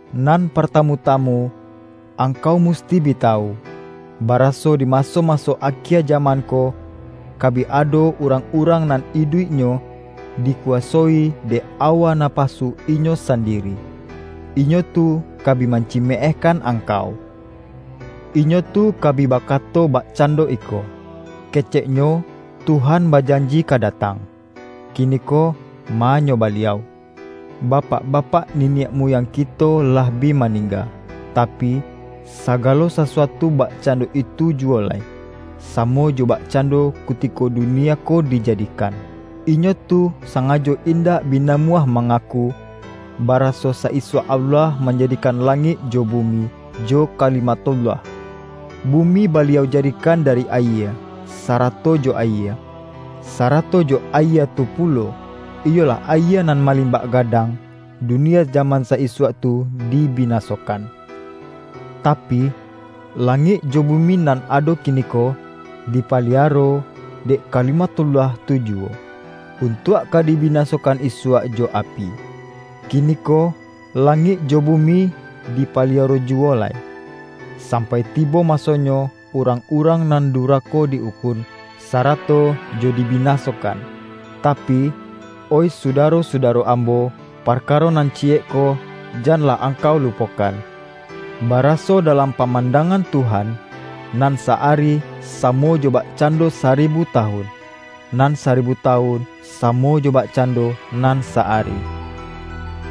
Nan partamu-tamu, angkau mus-ti bi tawu, baraso di maso-maso akie jaman ko, ka bi ado urang-urang nan iduiknyo, dikuwasoi dek awa napa-su inyo sandiri. Inyo tu ka bi manci-meehkan angkau, inyo tu ka bi ba-kato bakcando iko,”Keceknyo Tuhan bajanji ka datang! Kiniko manyo Ba-liau? Bapak-bapak niniak muyang ki-to lah bi maningga, tapi, sagalo sa-suatu bakcando itu juwo lai, samo jo bakcando kutiko dunia ko dijadikan!” Inyo tu sangajo indak bi namuah ma-ngaku, baraso sa-isuak Allah manjadi-kan langik jo bumi, jo kalimathullah. Bumi Baliau jadikan dari ayie, sara-to jo ayie; sarato jo ayie tu pulo — iyolah ayie nan malimbak gadang — dunia jaman sa-isuak tu dibinasokan. Tapi, langik jo bumi nan ado kiniko, dipaliaro dek kalimathullah tu juwo, untuak ka dibinasokan isuak jo api. Kiniko, langik jo bumi dipaliaro ju-wo lai, sampai tibo masonyo urang-urang nan durako di-ukun, sarato jo dibinasokan. Tapi, oih sudaro-sudaro ambo, parkaro nan ciyek ko, janlah angkau lupokan: baraso dalam pamandangan Tuhan, nan sa-ari, samo jo bakcando saribu tawun, nan saribu tawun, samo jo bakcando nan sa-ari.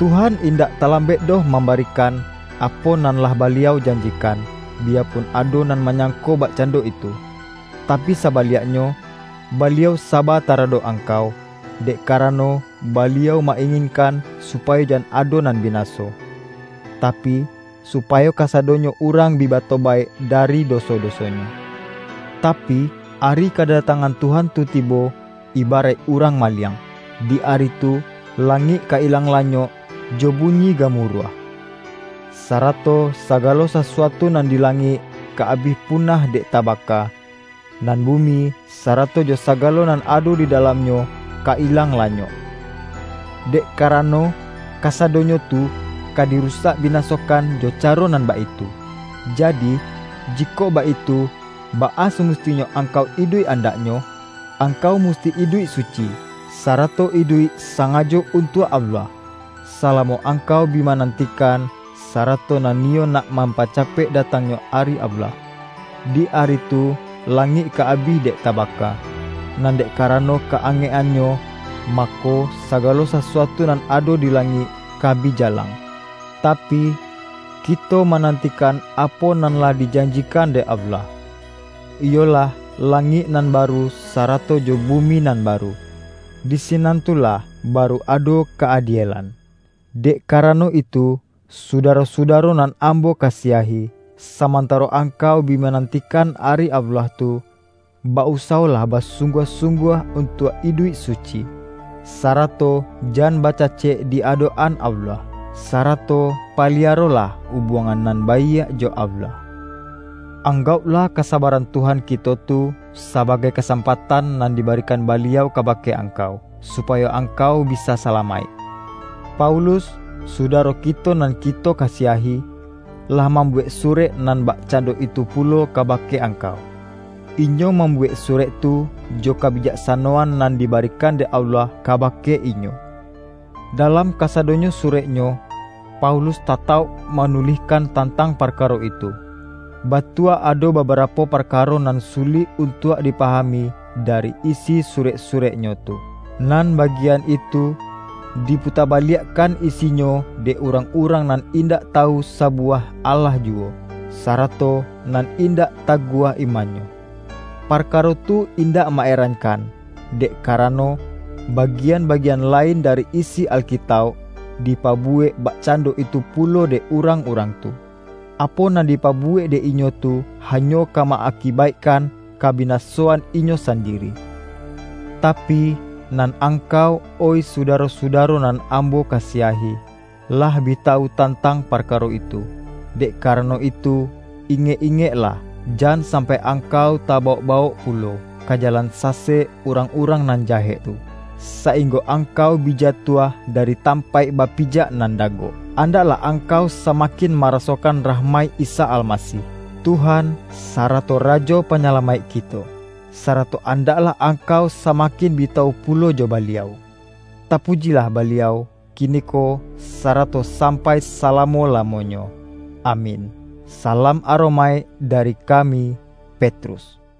Tuhan indak talambek doh mambarikan, apo nan lah Baliau janjikan, biyapun ado nan manyangko bakcando itu. Tapi saba-liaknyo, Baliau saba taradok angkau, dek karano, Baliau ma-inginkan su-payo jan ado nan binaso. Tapi, supa-yo kasadonyo urang bi batobaik dari doso-dosonyo. Tapi, Ari kadatangan Tuhan tu, tibo ibaraik urang maliang. Di Ari tu, langik ka ilang lanyok jo bunyi gamu-ruah, sarato sagalo sasuatu nan di la-ngik, ka abih punah dek tabaka, nan bumi, sarato jo sagalo nan ado di da-lamnyo, ka ilang lanyok. Dek ka-rano, kasadonyo tu ka dirusak bina-sokan jo caro nan baitu, jadi, jikok baitu, baa samustinyo angkau iduik andaknyo? Angkau musti iduik su-ci, sarato iduik sangajo untuak Allah, salamo angkau bi manantikan, sa-rato nan niyo nak mampacapek da-tangnyo Ari Allah. Di Ari tu, langik ka abih dek tabaka, nan dek karano ka-angek-annyo, mako, sagalo sasuatu nan ado di langik ka bi jalang. Tapi, kito manantikan apo nan lah dijanji-kan dek Allah, iyolah, langik nan ba-ru sarato jo bumi nan baru, di sinan tu lah baru ado ka-adielan. Dek karano itu, sudaro-sudaro nan ambo kasiahi, samantaro ang-kau bi manantikan Ari Allah tu, ba-usawolah basungguah-sungguah un-tuak iduik suci, sarato jan bacacek di adok-an Allah. Sarato paliaro-lah ubuangan nan baiak jo Allah. Anggauklah kasabaran Tuhan kito tu, sabagai kasampatan nan dibari-kan Baliau kabake angkau, supayo angkau bisa salamaik. Paulus, suda-ro kito nan kito kasiahi, lah mam-buwek surek nan bakcando itu pu-lo kabake angkau. Inyo mambuwek surek tu jo kabijaksanoan nan diba-rikan dek Allah kabake inyo. Da-lam kasadonyo sureknyo, Paulus tatauk manulihkan tantang parkaro itu. Batua ado babarapo parkaro nan sulik untuak dipahami dari isi surek-sureknyo tu. Nan bagian itu, diputa baliakkan isinyo dek urang-urang nan indak tawu sabuwah alah juwo, sarato nan indak taguah iman-nyo. Parkaro tu indak ma-erankan, dek karano, bagian-bagian lain da-ri isi Alkitauk, dipabuwek bakcan-do itu pulo dek urang-urang tu. Apo nan dipabuwek dek inyo tu, hanyo ka ma-akibaikkan kabinasoan inyo sandiri. Tapi, nan angkau, oih sudaro-sudaro nan ambo kasiahi, lah bi ta-wu tantang parkaro itu. Dek karano itu, ingek-ingeklah, jan sampai ang-kau tabawok-bawok pulo, ka jalan sa-sek urang-urang nan jahek tu, sainggo angkau bi jatuah dari tampaik bapijak nan dagok. Andaklah angkau sama-kin marasokan rahmaik Isa Almasih, Tuhan sarato Rajo Panyalamaik ki-to, sarato andaklah angkau samakin bi tawu pulo jo Baliau. Tapujilah Ba-liau, kiniko sarato sampai salamo-la-monyo! Amin! Salam aromaik dari kami, Petrus